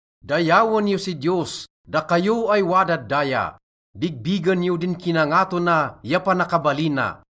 Dayawen yo si Diyos, dakayo ay wadad daya, bigbigen yo din kinangato na ya panakabalina.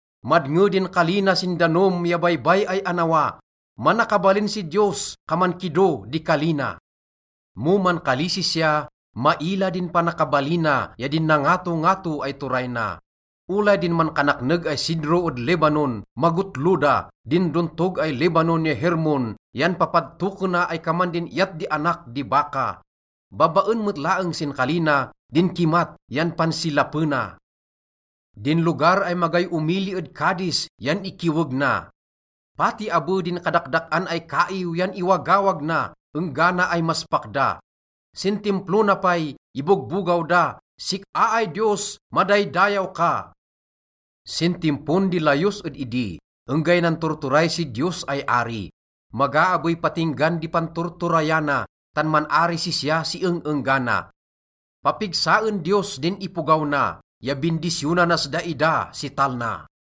Madnge din kali na sin danom ya baybay ay annawa, manakabalin si Diyos, kaman kido di kali na. Mo mankali sisya, maila din panakabalina ya din nangatongato ay turay na. Olay din mankanakneg ay sidro ed Lebanon, magotlo da, din dontog ay Lebanon ya Hermon yan papadtokena ay kaman din iyat di anak di baka. Babaen met laeng sin kali na, din kimat yan pansilapena, din lugar ay magay omili ed Kades yan ikiweg na. Pati abe din kadadak-an ay kaiw yan iwagawag na enggana ay maspak da. Sin Timplo na pay, ibogbogaw da, “Sik-a ay Diyos, madaydayaw ka!” Sin timpon di layos ed idi, enggay nanturturay si Diyos ay ari. Maga abey patinggan di panturturayana, tan man-ari sisya si eng-enggana. Papigsaen Diyos din ipogaw na, ya bindisyonanas daida si talna.